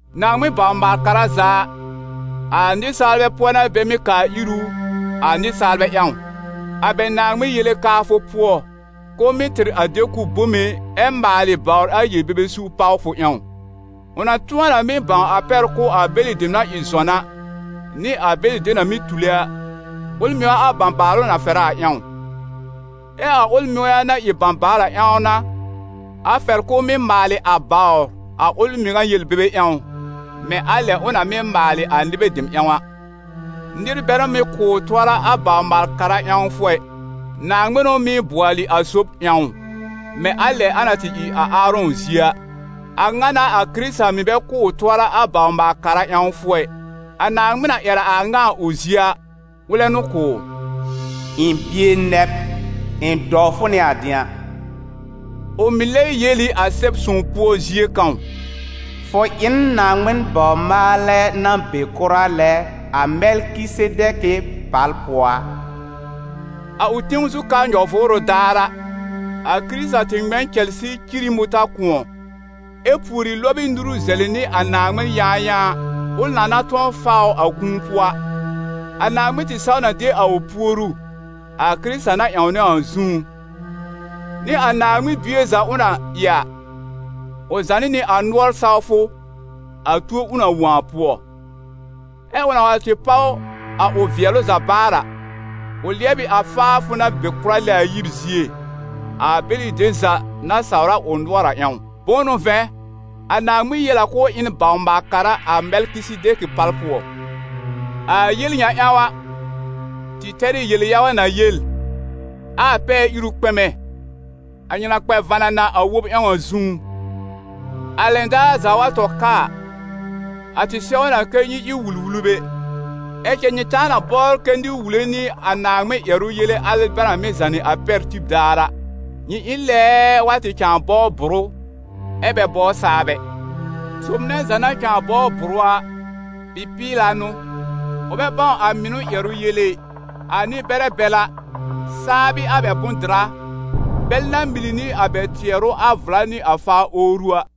Naaŋmɩn baw-maal kara za a, a nɩsaalbɛ pʋɔ n'a bɛ mɩ́ kaa ir ʋ a nɩsaalbɛ ƴãw, a bɛ Naaŋmɩn yele kaafʋ pʋɔ, k'ʋʋ mɩ́ tɩr a de-kʋb bome ɛ maalɩ bawr a yel-bebe suur pawfʋ ƴãw. Ʋ na tʋ̃ɔ na mɩ́ bãw a pɛr kʋ̀ a bɛlɩ dem na ɩ zɔn a, nɩ a bɛlɩ dem na mɩ́ tule a, ʋl mɩŋa a bãbaalʋ na fɛrɛ a ƴãw. Ɛ a ʋl mɩŋa na ɩ bãbaal a ƴãw n'a, a fɛr k'ʋʋ mɩ́ maalɩ a bawr a ʋl mɩŋa yel-bebe ƴãw, mɛ̃ a lɛ ʋ na mɩ́ maalɩ a nɩbɛ dem ƴãw a. Nɩr bɛ n'ʋ mɩ́ kʋ̀ ʋ tʋɔra a bawr-maal-kara ƴãwfʋ ɛ, Naaŋmɩn n'ʋ mɩ́ bʋɔlɩ a sob ƴãw ʋ, mɛ̃ a lɛ a na tɩ ɩ a Aarɔ̃ zie a. A ŋa n'a a Kɩrɩta mɩ̀ bɛ kʋ̀ ʋ tʋɔra a bawr-maal-kara ƴãwfʋ ɛ. A Naaŋmɩn na ƴɛr a a ŋa a ʋ zie a, ʋlɛ n'ʋ kʋ̀ ʋ: «Ɩ̃ bie nɛ b, ɩ̃ dɔw fʋ nɩ a dɩ̃a.» Ʋ mɩ̀ lɛ yel ɩ a Sɛb-sõw pʋɔ zie kãw: «Fʋ ɩ n Naaŋmɩn bawr-maalɛ na be kʋra lɛ a Mɛlkɩsedɛkɩ pal pʋɔ a.» A ʋ tẽw zu ka nyɔ-vʋʋrʋ daar a, a Kɩrɩta tɩ ŋmɛ n cɛlsɩ cir ɩ mʋtã-kʋ̃ɔ, ɛ pùori lɔb ɩ nuru zɛlɩ nɩ a Naaŋmɩn yãayãa, ʋl na na tʋ̃ɔ faa ʋ a kũu pʋɔ a. A Naaŋmɩn tɩ saw na de a ʋ puoru, a Kɩrɩta na ƴãwnɛ ʋ a zũú. Nɩ a Naaŋmɩn Bie za ʋ na ɩ a, ʋ zànɩ nɩ a nʋɔr sawfʋ, a tuo ʋ na wõ a pʋɔ. Ɛ ʋ na wa tɩ páw a ʋ vɩɛlʋ za baar a, ʋ lɩɛb ɩ a faafʋ na be kʋra lɛ a yib zie, a bɛlɩ dem za na sawr a ʋ nʋɔr a ƴãw. Bʋ̃ʋ n'ʋ vɛ̃, a Naaŋmɩn yel a k'ʋʋ ɩ n bawr-maal-kara a Mɛlkɩsedɛkɩ pal pʋɔ. A yel ŋa ƴãw a, tɩ tɛr ɩ yel-yaga na yel, ɛ a pɛɛ-iru kpɛmɛ, a nyɩ na kpɛ vanana a wob ƴãw a zũú. A lɛn daar za wa tɔ ka a, a tɩ sɛw na kɛ́ nyɩ ɩ wul-wulbɛ, ɛ cɛ nyɩ cãa na bɔbr kɛ nɩr wule nyɩ a Naaŋmɩn ƴɛrʋ yele al bɛ na mɩ́ zànɩ a pɛr tib daar a. Nyɩ ɩ n lɛɛɛ wa tɩ cãa bɔbr bʋrʋ, ɛ bɛ bɔbr saab ɛ. Sob nɛ za na cãa bɔbr bʋrʋ a, bɩ-pɩɩla n'ʋ, ʋ bɛ bãw a mɩnʋ ƴɛrʋ yele ɩ. A nɩ-bɛrɛ bɛl a, saab ɩ a bɛ bʋ̃-dɩra, bɛl na mili nɩ a bɛ tɩɛrʋ a vla nɩ a faa owru a.